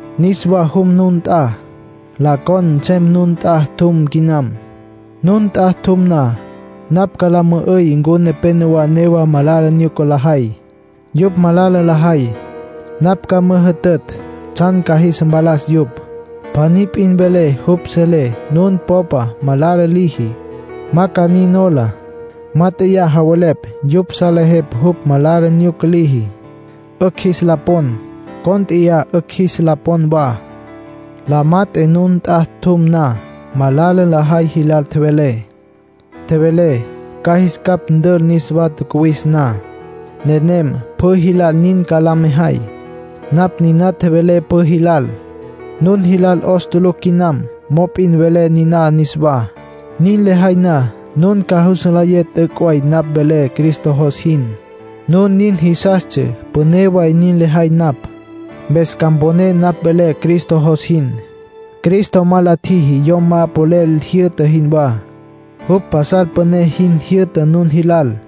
Niswa jum nun nt'a; la con nsem nun nt'a tjum quinam. Nun nt'a tjum na, napj ca la mü'üy ncu nepénowa newa malala nyuca lajay. Yupj malala lajay, napj ca müjütütj tsjan ca jis mpalas yupj. Pjaní p'in vele jupj selé nun popa malala liji, ma ca nin nola. “Mát'eya javelepj yupj salejepj jupj malala nyuca liji, 'ücj jis la pon. Cónt'eya 'ücj jis la pon wa.” La mat'e nun nt'a tjum na, malala lajay jilal tjevelé. Tjevelé ca jis capj ntül niswa tjacuwis na. Nenem pjü jilal nin ca la mejay. Napj niná tjevelé pjü jilal. Nun jilal 'os tulucj quinam mop'in velé niná niswá. Nin lejay na, nun ca jus nlayé t'üc' way napj velé Cristo jos jin. Nun nin jisastsja püné way nin lejay napj, mpes ca mponé napj velé Cristo jos jin. Cristo ma la tjiji yom ma polel jyü'ta jinwá. Jupj pasal püné jin jyü'ta nun jilal.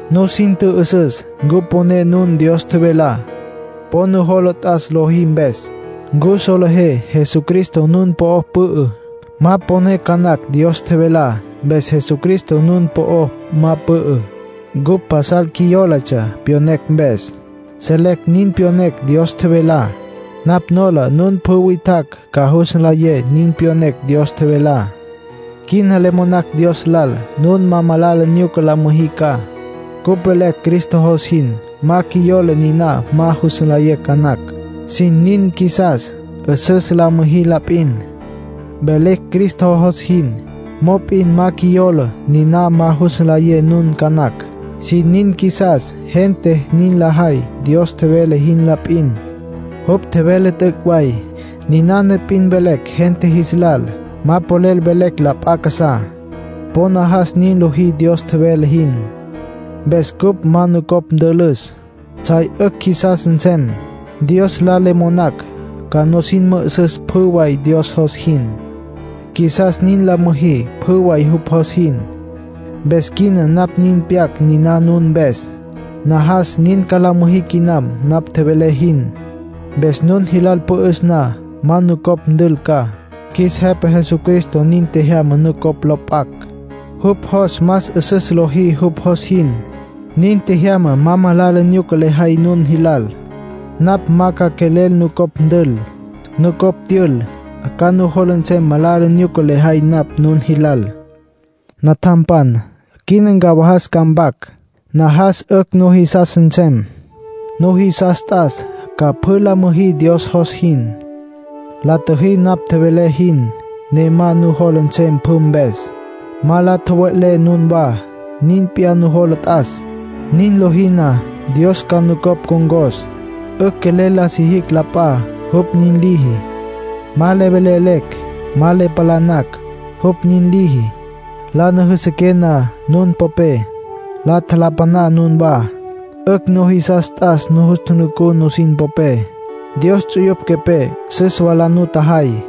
Nusin tjü'üsüs ncu poné nun Dios tjevelá. Po nujola t'as lojí mpes. ¿Ncu solejé Jesucristo nun po'o pü'ü? Ma poné ca nacj Dios tjevelá, mpes Jesucristo nun po'o ma pü'ü. Cupj pasal qjuiyólatsja pyonecj mpes. Selecj nin pyonecj Dios tjevelá. Napj nola nun pjü witjacj ca jus nlayé nin pyonecj Dios tjevelá. Quina le monacj Dios lal nun ma malala nyuca la müjí ca. Cupj velecj Cristo jos jin, ma qjuiyola niná ma jus nlayé ca nacj. Sin nin qjuisas 'üsüs la müjí la p'in. Velecj Cristo jos jin, mop'in ma qjuiyola niná ma jus nlayé nun ca nacj. Sin nin qjuisas gente nin lajay Dios tjevele jin la p'in. Jupj tjevele t'üc' way. Ninana p'in velecj gente jis lal. Ma polel velecj la p'a casá. Po najas nin lojí Dios tjevele jin. Mpes cupj ma nucopj ntülücj, tsjay 'ücj qjuisas nsem. Dios lal le monacj ca nusin mü'üsüs pjü way Dios jos jin. Qjuisas nin la müjí pjü way jupj jos jin. Mpes quina napj nin pyac niná nun mpes. Najas nin ca la müjí quinam napj tjevelé jin. Mpes nun jilal pü'üs na, ma nucopj ntül ca. Qjuis Jepa Jesucristo nin tjejyama nucopj lo p'acj, jupj jos más 'üsüs lojí jupj jos jin. Nin tjejyama ma malala nyuca lejay nun jilal. Napj ma ca quelel nucopj ntül. Nucopj tyül, ca nujola nsem malala nyuca lejay napj nun jilal. Natjampan, quina ca ncawajas mpac. Najas 'ücj nujisas nsem. Nujisas t'as ca pjü la müjí Dios jos jin. La tjüjí napj tjevelé jin, ne ma nujola nsem pjü mpes. Ma la tjowe'lé nunwá. Nin p'iyá nujola t'as. Nin lojí na, Dios ca nucopj ncon̈cos. 'Ücj quelel la sijicj la p'a, jupj nin liji. Ma le velelecj, ma le palanacj, jupj nin liji. La nüjüsüqué na nun popé, la tjalapaná nunwá. 'Ücj nujisas t'as nujus tjunucú nusin popé. Dios ts'uyupj quepé süs wa la nutjajay.